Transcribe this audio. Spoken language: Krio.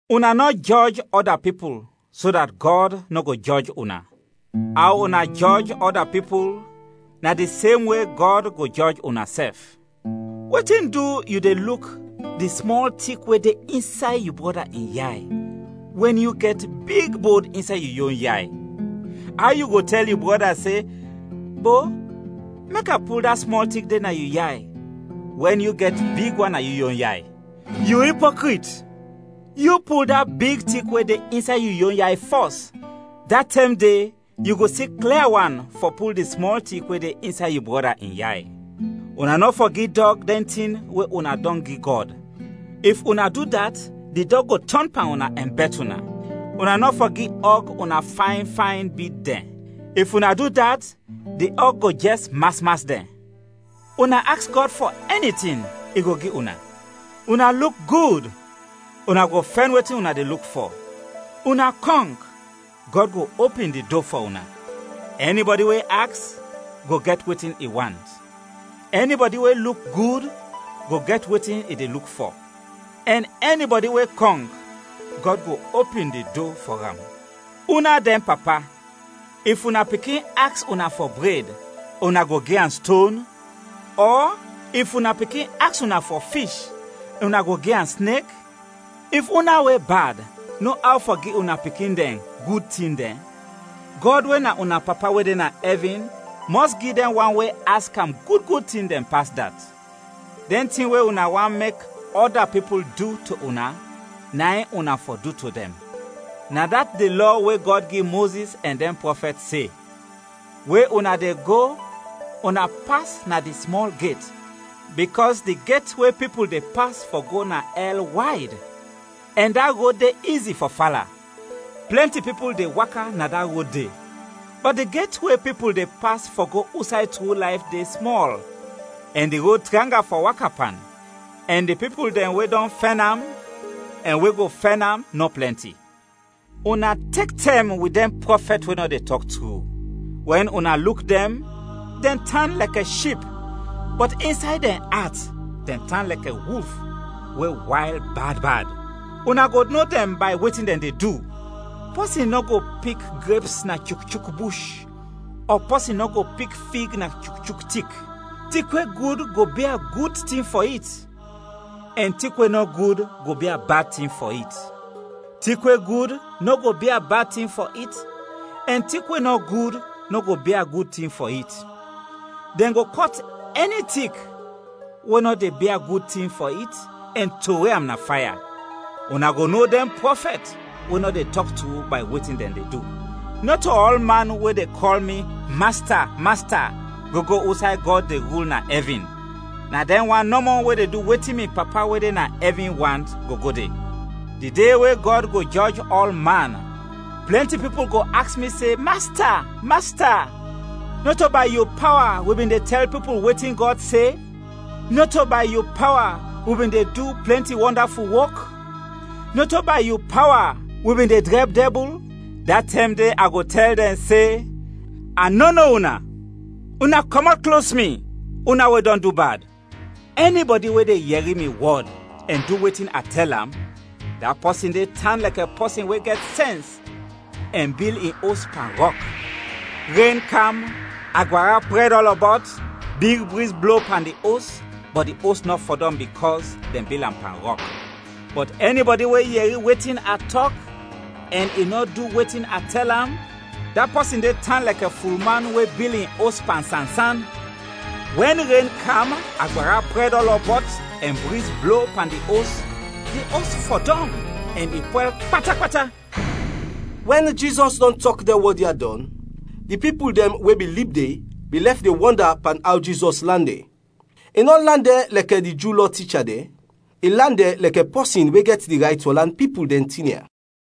“Una nɔ jɔj ɔda pipul, so dat Gɔd nɔ go jɔj una. Aw una jɔj ɔda pipul, na di sem we Gɔd go jɔj unasɛf. Wetin du yu de luk di smɔl tik we de insay yu brɔda in yay, wɛn yu gɛt big bod insay yu yon yay? Aw yu go tɛl yu brɔda se, ‘Bo, mek a pul da smɔl tik de na yu yay,’ wɛn yu gɛt big wan na yu yon yay? Yu ipokrit! Yu pul da big tik we de insay yu yon yay fɔs, da tɛm de yu go si klia wan fɔ pul di smɔl tik we de insay yu brɔda in yay. “Una nɔ fɔ gi dɔg dɛn tin we una dɔn gi Gɔd, if una du dat di dɔg go tɔn pan una ɛn bɛt una. Una nɔ fɔ gi ɔg una fayn fayn bid dɛn, if una du dat, di ɔg go jɛs mas mas dɛn. “Una aks Gɔd fɔ ɛni tin, i go gi una; una luk gud, una go fɛn wetin una de luk fɔ; una kɔnk, Gɔd go opin di do fɔ una. Ɛnibɔdi we aks, go gɛt wetin i want; ɛnibɔdi we luk gud, go gɛt wetin i de luk fɔ; ɛn ɛnibɔdi we kɔnk, Gɔd go opin di do fɔ am. Una dɛn papa, if una pikin aks una fɔ bred, una go gi am ston? Ɔ if una pikin aks una fɔ fish, una go gi am snek? If una we bad no aw fɔ gi una pikin dɛn gud tin dɛn, Gɔd we na una Papa we de na ɛvin, mɔs gi dɛn wan we aks am gud, gud tin dɛn pas dat. “Dɛn tin we una want mek ɔda pipul du to una, na in una fɔ du to dɛn. Na dat di Lɔ we Gɔd gi Mozis ɛn dɛn prɔfɛt se. “We una de go, una pas na di smɔl get, bikɔs di get we pipul de pas fɔ go na ɛl wayd, ɛn da rod de izi fɔ fala; plɛnti pipul de waka na da rod de. Bɔt di get we pipul de pas fɔ go usay tru layf de, smɔl, ɛn di rod tranga fɔ waka pan, ɛn di pipul dɛn we dɔn fɛn am ɛn we go fɛn am, nɔ plɛnti. “Una tek tɛm wit dɛn prɔfɛt we nɔ de tɔk tru; wɛn una luk dɛn, dɛn tan lɛkɛ ship, bɔt insay dɛn at, dɛn tan lɛkɛ wulf we wayl bad bad. Una go no dɛn bay wetin dɛn de du. Pɔsin nɔ go pik greps na chukchuk bush ɔ pɔsin nɔ go pik fig na chukchuk tik. Tik we gud go bia gud tin fɔ it, ɛn tik we nɔ gud go bia bad tin fɔ it. Tik we gud nɔ go bia bad tin fɔ it ɛn tik we nɔ gud nɔ go bia gud tin fɔ it. Dɛn go kɔt ɛni tik we nɔ de bia gud tin fɔ it ɛn trowe am na faya. Una go no dɛn prɔfɛt we nɔ de tɔk tru bay wetin dɛn de du. “Nɔto ɔlman we de kɔl mi, ‘Masta, Masta’ go go usay Gɔd de rul na ɛvin. Na dɛn wan nɔmɔ we du wetin mi Papa, we de na ɛvin, want, go go de. Di de we Gɔd go jɔj ɔlman, plɛnti pipul go aks mi se, ‘Masta, Masta! Nɔto bay yu pawa wi bin de tɛl pipul wetin Gɔd se? Nɔto bay yu pawa wi bin de du plɛnti wɔndaful wok? Nɔto bay yu pawa wi bin de drɛb dɛbul?’ Da tɛm de a go tɛl dɛn se, ‘A nɔ no una, una kɔmɔt klos mi, una we dɔn du bad.’ “Ɛnibɔdi we de yɛri mi wɔd ɛn du wetin a tɛl am, da pɔsin de tan lɛk pɔsin we gɛt sɛns ɛn bil in os pan rɔk. Ren kam, agbara prɛd ɔlɔbɔt, big briz blo pan di os, bɔt di os nɔ fɔdɔm bikɔs dɛn bil am pan rɔk. “Bɔt ɛnibɔdi we yɛri wetin a tɔk ɛn i nɔ du wetin a tɛl am, da pɔsin de tan lɛk fulman we bil in os pan sansan. Wɛn ren kam, agbara prɛd ɔlɔbɔt ɛn briz blo pan di os, di os fɔdɔm ɛn i pwɛl pata pata.” Wɛn Jizɔs dɔn tɔk dɛn wɔd ya dɔn, di pipul dɛn we bin lib de, bin lɛf de wɔnda pan aw Jizɔs lan dɛn. I nɔ lan dɛn lɛkɛ di Ju Lɔ ticha dɛn, i lan dɛn lɛkɛ pɔsin we gɛt di rayt fɔ lan pipul dɛn tin ya.